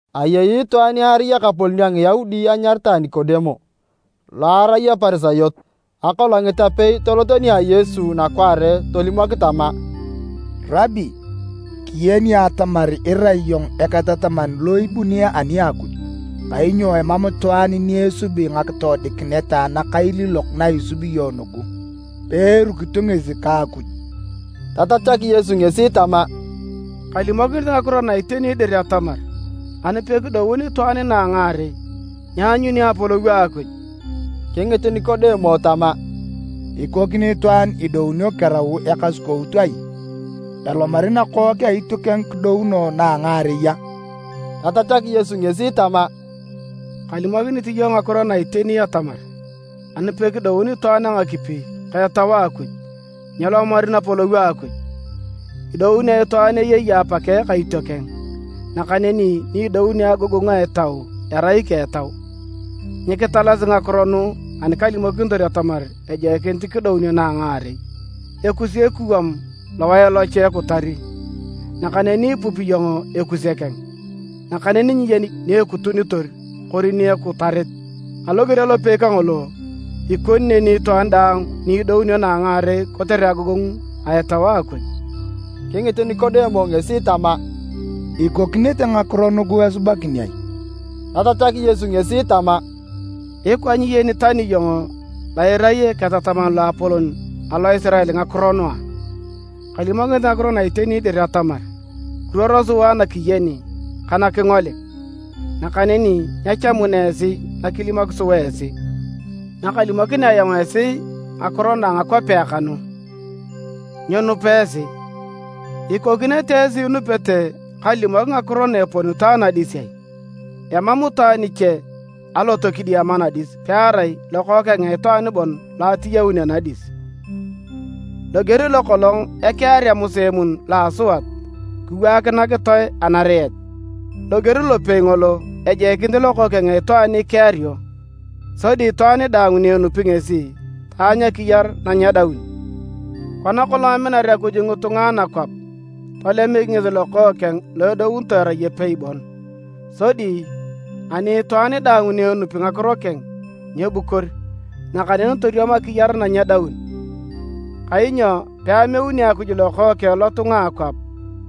Ayei itwaan ni arai ekapolon a Ngiyaudi anyaritae Nikodemo, lo arai Eparisayot. Akolongit apei tolot nia Yesu nakwaare tolimok tama, “Rabi, kiyeni atamar irai iyong eketataman lo ibuni ani a Akuj, kainyo emam itwaan ni esubi ngakitoodikinet nakailiilok na isubi iyong nugu, peerukito ngesi ka Akuj.” Tatachak Yesu ngesi tama, “Kalimokinit ngakiro na iteni dir atamar, ani pekidoun itwaan na a ngaarei, nyeanyuni Apolou a Akuj.” Kingit Nikodemo tama, “Ikokini itwaan idounio kerau ekasukout ai? Elomari nakook a itiokeng kidounoe na a ngaarei a?” Tatachak Yesu ngesi tama, “Kalimokinit iyong ngakiro na iteni atamar, ani pekidoun itwaan a ngakipi ka Etau a Akuj, nyelomari Napolou a Akuj. Idounio itwaan eyei apakeng ka itiokeng, nakaneni ni idounio a agogongu a Etau, erai ika Etau. Nyikitalasi ngakiro nugu ani kalimokinitor atamar ejoikinit kidounio na a ngaarei. Ekusi ekuwam lowae locha ekutari, nakaneni ipupi iyong ekuse keng, nakaneni nyiyeni ni ekutunitor kori ni ekutarit. Aloger alopei kangolo, ikoni neni itwaan daang ni idounio na a ngaarei kotere agogongu a Etau a Akuj.” Kingit Nikodemo ngesi tama, “Ikokinete ngakiro nugu esubakin ai?” Tatachak Yesu ngesi tama, “Ikwa nyiyeni tani iyong lo irai eketataman loapolon alo Isirael ngakiro nugu a? Kalimokinit ngakiro na iteni dir atamar, kiruoro sua na kiyeni ka na kingolik, nakaneni nyechamuna esi nakilimok sua esi. Nakalimokinea ayong esi ngakiro na a ngakwapea kanu, nyiinupa esi, ikokinete esi inupete kalimok ngakiro na eponito anadis ai? Emam itwaan iche alot kidiama nadis, pearai Lokookeng a Itwaan bon lo atiyaun anadis.” Loger lokolong ekearea Musa emun lo a asuat kiwaak nakitoe anariet, loger lopei ngolo, ejoikinit Lokookeng a Itwaan ikeario, sodi itwaan daang ni enupi ngesi, taanyu akiyar na nyedaun. Kona kolong aminar Akuj ngitunga a anakwap, tolemik ngesi Lokookeng lo edounitoe erai epei bon, sodi ani itwaan daang ni enupi ngakiro keng, nyeebukor, nakaneni toriam akiyar na nyedaun. Kainyo peameuni Akuj Lokookeng lotunga a akwap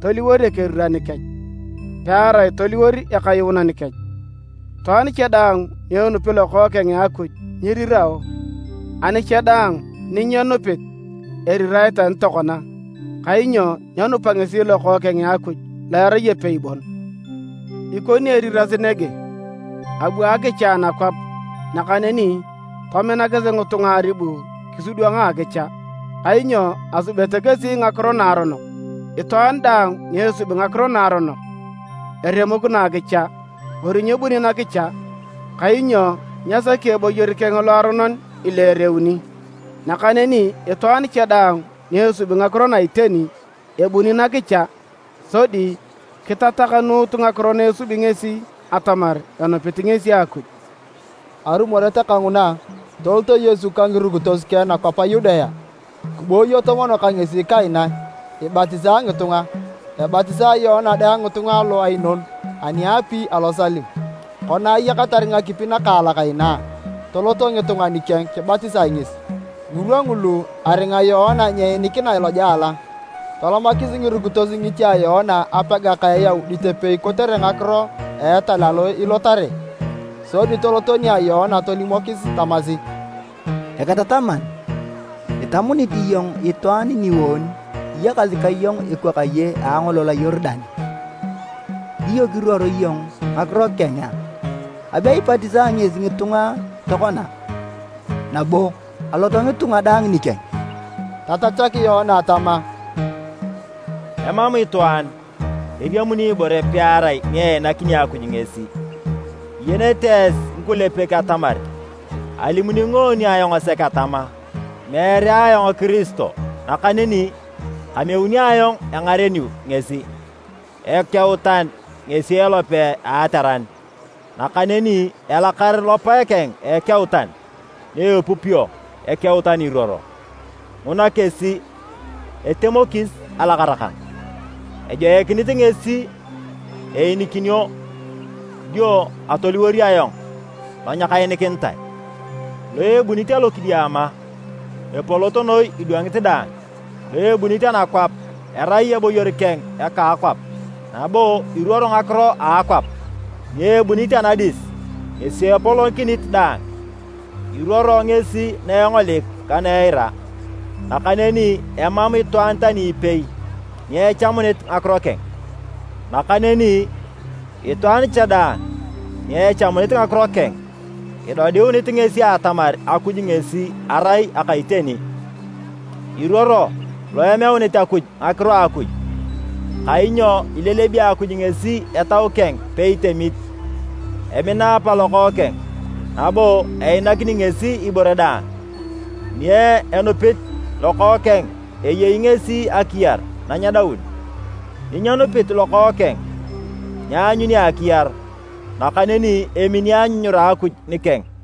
toliwor ekeriran kech, pearai toliwor Ekayuunan kech. Itwaan cha daang ni enupit Lokookeng a Akuj nyirirao, ani cha daang ni nyenupit, erirae tani tokona, kainyo nyenupa ngesi Lokookeng a Akuj lo erai epei bon. Ikoni eriras nege: abu akicha nakwap, nakaneni tominakis ngitunga aribu kisidwanga akicha, kainyo asubete kesi ngakiro naaronok. Itwaan daang ni esubi ngakiro naaronok, eremokino akicha kori nyebuni nakicha, kainyo nyesaki eboyor keng loaronon ileereuni. Nakaneni itwaan cha daang ni esubi ngakiro na a iteni, ebuni nakicha, sodi kitatakanuut ngakiro na esubi ngesi atamar enupit ngesi Akuj. Arumoret kanguna, toloto Yesu ka ngirukitos keng nakwap a Yudea. Kiboyoto mono ka kesi kaina, ibatisae ngitunga. Ebatisae Yoana dang ngitunga alo Ainoni ani aapi alo Salim. Kona ayakatar ngakipi nakaalak inaa, toloto ngitunga nikeng kibatisa ngesi. ( Ngirwa ngulu, aringa Yoana nyeenikina lojela). Tolomakis ngirukitos ngiche a Yoana apega ka Eyaudit epei kotere ngakiro a etal alo ilotare. Sodi toloto nia Yoana tolimokis tamasi, “Eketataman, itamunit iyong itwaan ningoon iyakasi ka iyong ekwakaye a angolol a Yorudan, dio kiruor iyong ngakiro keng a? Abe ibatisae ngesi ngitunga tokona, nabo alot ngitunga daang nikeng!” Tatachak Yoana tama, “Emam itwaan eriamuni ibore pearai ni einakini Akuj ngesi. Iyenete esi ngikulepek atamar alimuni ngoon ayong sek atama, ‘Meere ayong Kiristo, nakaneni kameunio ayong engareniu ngesi.’ Ekeutan ngesi elope a ateran, nakaneni elakar lopae keng a ekeutan na epupio ekeutan iruoro. Nguna kesi etemokis alakara kang. Ejoikinit ngesi eyenikinio dio atoliwor ayong lo nyekayenikinitae.” Lo ebunit alokidiama, epolot noi idwangit daang. Lo ebunit anakwap, erai eboyor keng eka akwap, nabo iruoro ngakiro a akwap. Ni ebunit anadis ngesi epolokinit daang. Iruoro ngesi na engolik ka na eira, nakaneni emam itwaan tani ipei ni echamunit ngakiro keng. Nakaneni itwaan cha daang ni echamunit ngakiro keng, idodiunit ngesi atamar Akuj ngesi erai aka iteni. Iruoro lo ameuni Akuj ngakiro a Akuj, kainyo ilelebi Akuj ngesi Etau keng peitemit. Emina Apa Lokookeng, nabo ainaki ngesi ibore daang. Ni enupit Lokookeng eyei ngesi akiyar na nyedaun, ni nyenupit Lokookeng nyeanyuni akiyar, nakaneni emini anyunyura a Akuj nikeng.